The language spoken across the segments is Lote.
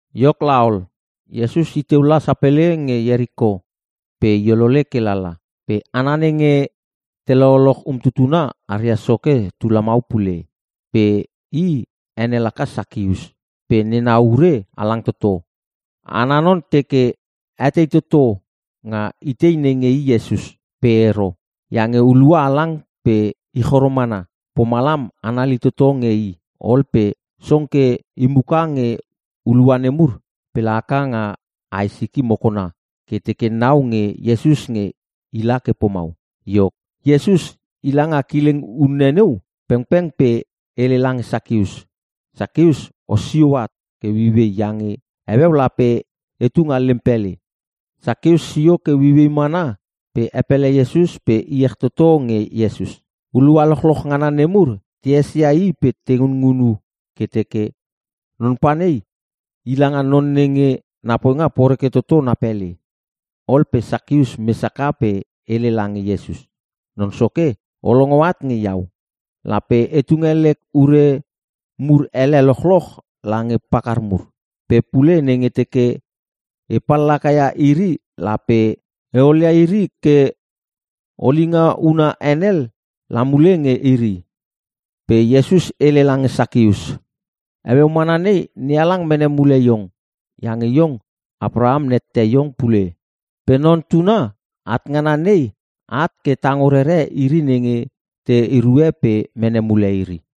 Iok laol, Iesus iteu la sapele nge Ieriko pe i olole ke lala. Pe hana nenge te lololoch umtutuna aria soke tu lamau pule. Pe i ene laka Sakius pe nena ure halang toto. Ana non teke etei toto nga itei nenge i Iesus. Pe ero, iange hulua halang pe i choro mana, pomalam anali toto nge i. Ol pe song ke i muka nge hulua nemur pe la haka nga ae siki mokona ke teke nau nge Iesus nge ila ke pomau. Iok, Iesus i langa kileng unne neu pengpeng pe hele lange Sakius, “Sakius, osio at ke ueiuei iange heueu lape etu nga lem pele.” Sakius sio ke ueiuei mana pe epele Iesus pe iech toto nge Iesus. Hulua lochloch ngana nemur te esia i pe te ngunngunu ke teke, “Non panei i langa non nenge na poinga poreke toto na pele!” Ol pe Sakius mes haka pe hele lange Iesus, “Non Soke, o longo at nge iau. Lape e tunge lek ure mur ele lochloch lange pakar mur. Pe pule nenge teke e pallaka ia iri lape e olia iri ke olinga huna henel la mule nge iri.” Pe Iesus hele lange Sakius, “Heueu mana nei NeHalang mene mule iong. Iange iong Apraham nette iong pule. Pe Non Tuna at ngana nei at ke tango rere iri nenge te erue pe mene mule iri.”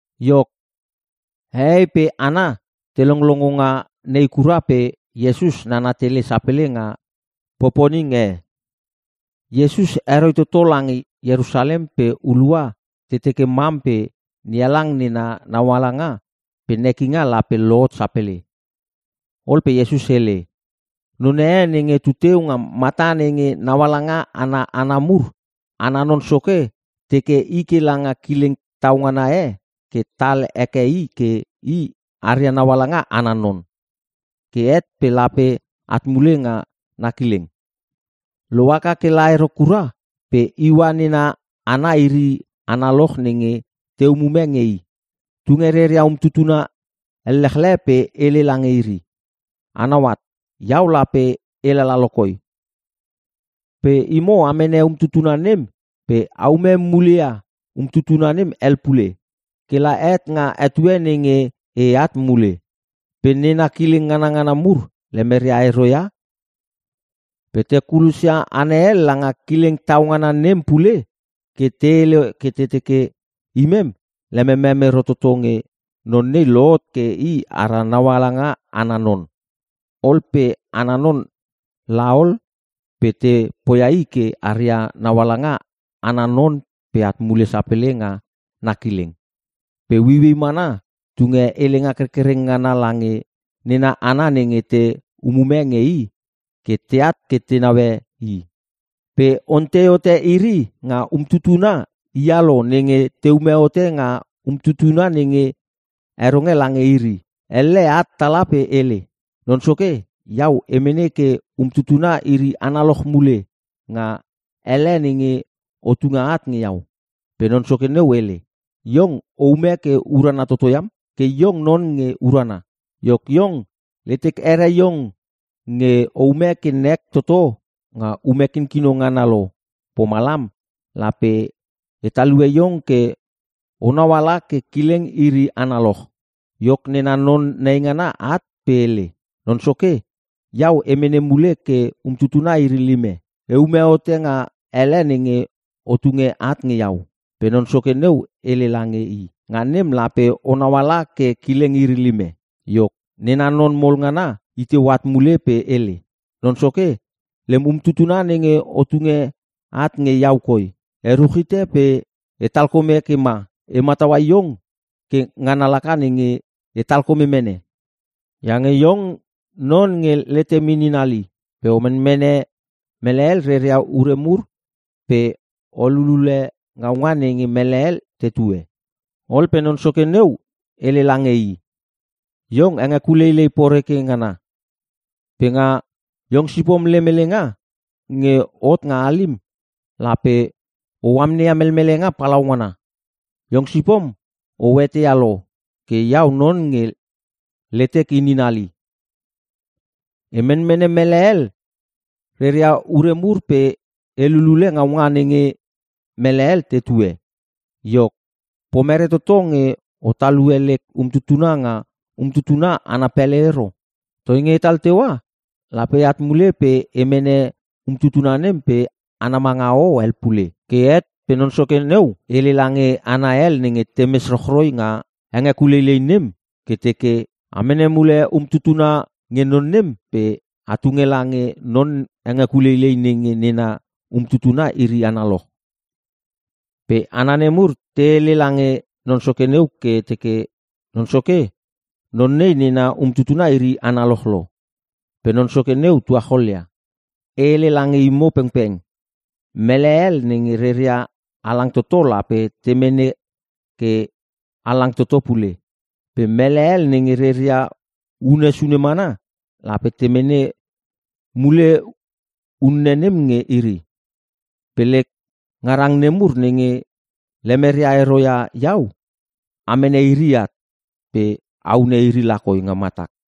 Iok, hehei pe hana te longlongo nga nei kura pe Iesus nana tele sapele nga poponing e. Iesus heroi toto lange Ierusalem pe hulua te teke mam pe NeHalang nena naualanga pe nekinga lape lohot sapele. Ol pe Iesus hele, “Non e nenge tuteu nga mata nenge naungaala ana hana mur. Ana non soke teke i ke langa kileng tau ngana e ke tal heke i ke i aria naungaala ana non. Ke het pe lape at mule nga na kileng. Lohaka ke la ero kura pe iua nena hana iri analoch nenge te umume nge i. Tunge reria umtutuna ellechle pe hele lange iri, ‘Anau at, iau lape e lala lo koi. Pe imo a mene umtutuna nem pe a ume mule ia umtutuna hel pule. Ke la het nga etue nenge eat mule.’ “Pe nena kileng nganangana mur lemeria ero ia i pe te kulosia hana hel langa kileng tau ngana nem pule ke te hele ke te teke, ‘Imem lememem ero toto nge non nei lohot ke i ara naungaala ana non.’ “Ol pe ana non la ol pe te poia i ke i aria naungaala ana non pe at mule sapele nga na kileng. Pe ueiuei mana tunge helenga kerkereng ngana lange nena hana nenge te umume nge i ke teat ke te neue i, pe ontei hote iri nga umtutuna hia lo nenge teume hote nga umtutuna nenge heronge lange iri. Elle at tala pe hele, ‘Non soke, iau e mene ke umtutuna iri analoch mule nga elle nenge o tunge at nge iau.’ “Pe non Soke neu hele, ‘Iong oume ke urana toto iam! Ke iong non nge urana. Iok, iong letek here iong nge oume ke nek toto nga ume kinkino ngana lo pomalam, lape e talue iong ke onau ala ke kileng iri analoch.’ “Iok nena non naingana at pe hele, ‘Non soke, iau e mene mule ke umtutuna iri lime. Eume hote nga elle nenge o tunge at nge iau.’ “Pe non soke neu hele lange i, ‘Nga nem, lape onau ala ke kileng iri lime.’ “Iok, nena non mol ngana iteu at mule pe hele, ‘Non soke lem umtutuna nenge o tunge at nge iau koi, e ruchite pe e talkome ke ma. E mataua iong ke ngana laka nenge e talkome mene, iange iong non nge letem inin hali pe o menmene mele hel reria ure mur pe o lulule ngaunga nenge mele hel tetue.’ “Ol pe non soke neu hele lange i, ‘Iong hengekuleilei poreke ngana. Pe nga iong sipom lem helenga nge hot nga halim, lape o amneia melmelenga palaungana! Iong sipom o eteia lo ke iau non nge letek inin hali. E menmene mele hel reria ure mur pe e lulule ngaunga nenge mele hel tetue. Iok, pomere toto nge o talue lek umtutuna nga umtutuna ana pele ero? Toi nge otal teua, lape eat mule pe e mene umtutuna nem pe ana manga hoho hel pule.’ “Ke het, pe non soke neu hele lange hana hel nenge te mes rochroi nga henge kuleilei nem ke teke, ‘A mene mule umtutuna nge non nem pe at tunge lange non hengekuleilei nenge nena umtutuna iri analoch.’ “Pe hana nemur te hele lange non soke neu ke teke, ‘Non soke, non nei nena umtutuna iri analoch lo!’ “Pe non soke neu tuacholia, ‘E hele lange imo pengpeng, mele hel nenge reria halang toto lape te mene ke halang toto pule. Pe mele hel nenge reria unne sune mana lape te mene mule unne nem nge iri. Pe lek ngarang nemur nenge lemeria ero ia iau a mene iri at pe a hune iri lakoi nga matak.’”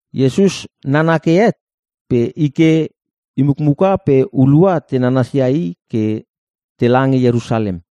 Iesus nana ke het pe i ke i mukmuka pe hulua te nanasia i ke tela nge Ierusalem.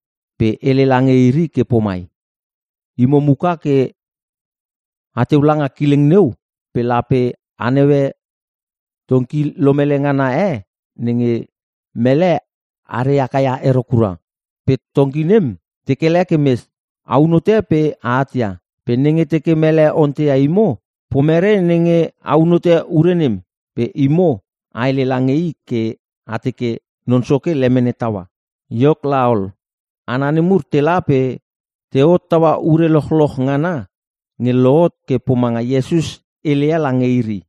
Pe hele lange iri ke pomai, “Imo muka ke ateu langa kileng neu pe lape a neue tongki lomele ngana e nenge mele are haka ia ero kura. Pe tongki nem, te kele ke mes. Aun hote pe a atia. Pe nenge teke mele onteia imo, ‘Pomere nenge aun hote ure nem?’ Pe imo a hele lange i ke a teke, ‘Non soke lemene taua.’” Iok laol, hana nemur tela pe te hottaua ure lochloch ngana nge lohot ke pomanga Iesus heleia lange iri.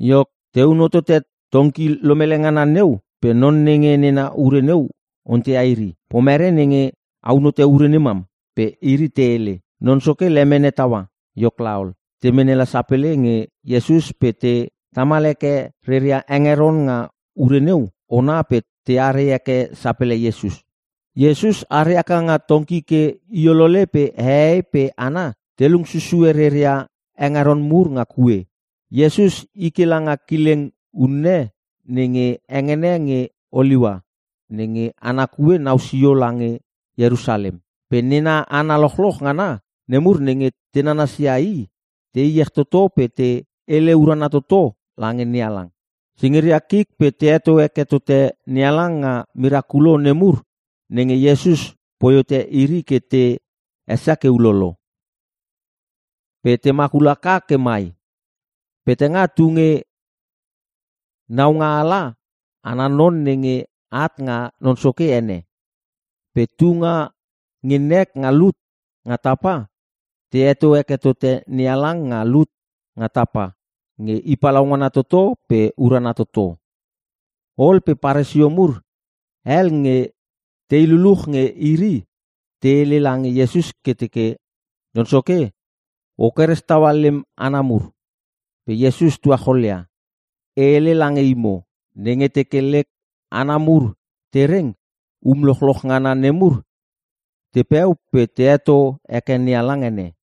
Iok, teun hotote tongki lomele ngana neu pe non nenge nena ure neu onteia iri, “Pomere nenge aun hote ure nemam?” Pe iri te hele, “Non soke lemene taua.” Iok laol, te mene la sapele nge Iesus pe te tamal heke reria hengeron nga ure neu ona pe teare heke sapele Iesus. Iesus are haka nga tongki ke iolole pe hehei pe hana te lung susue reria hengeron mur nga kue. Iesus i ke langa kileng unne nenga hengene nge Oliua nenge ana kue nau sio lange Ierusalem. Pe nena hana lochloch ngana nemur nenge te nananasia i te iech toto pe te hele urana toto lange NeHalang. Singiria kik pe te heto heke tote NeHalang nga mirakulo nemur nenge Iesus poi hote iri ke te esia ke ulolo. Pe te makul haka ke mai, “Petanga tunge Naunga ala ana non nenge at nga Non Soke ene! Pe tunga nge nek nga lut nga tapa! Ta heto heke tote NeHalang nga lut nga tapa nge i palaungana toto pe urana toto!” Ol pe Paresio mur hel nge tei luluch nge iri te hele lange Iesus ke teke, “Non soke, o keres taua lem hana mur.” Pe Iesus tuacholia, “E hele lange imo, nenge teke lek hana mur te reng, um lochloch ngana nemur tepeu pe te heto heke NeHalang ene.”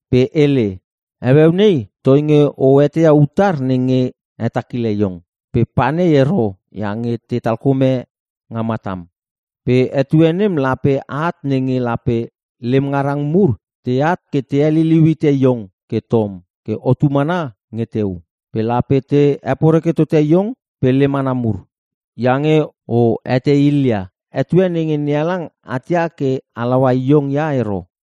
Pe hele, “Heueu nei, toinge o eteia utar nenge hetakile iong. Pe pa nei ero iange te talkome nga matam. Pe etue nem lape at nenge lape lem ngarang mur teat ke te heliliu hite iong ke tom ke otu mana nge teu. Pe lape te heporeke tote iong pe lem hana mur, iange o etei ilia etue nenge NeHalang atia ke halau iong ia ero!”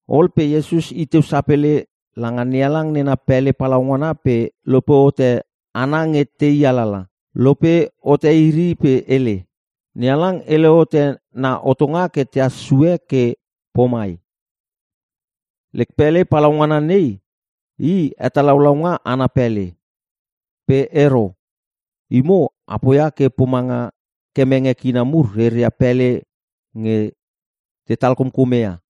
Ol pe Iesus iteu sapele langa NeHalang nena pele palaungana pe lope hote hana nge tei alala. Lope hote iri pe hele, “NeHalang hele hote na hotonga ke tehas sue ke pomai, ‘Lek pele palaungana nei, i hetalaulaunga ana pele!’ Pe ero. Imo, a poia ke pomanga kemenge kina mur reria pele nge tetal komkome ia.”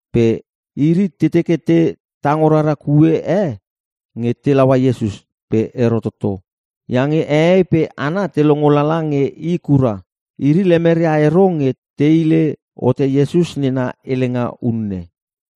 Pe iri te teke te tango rara kue e nge te laua Iesus. Pe ero toto, iange hehei pe hana te longo lala nge i kura. Iri lemeria ero nge te hile hote Iesus nena helenga unne.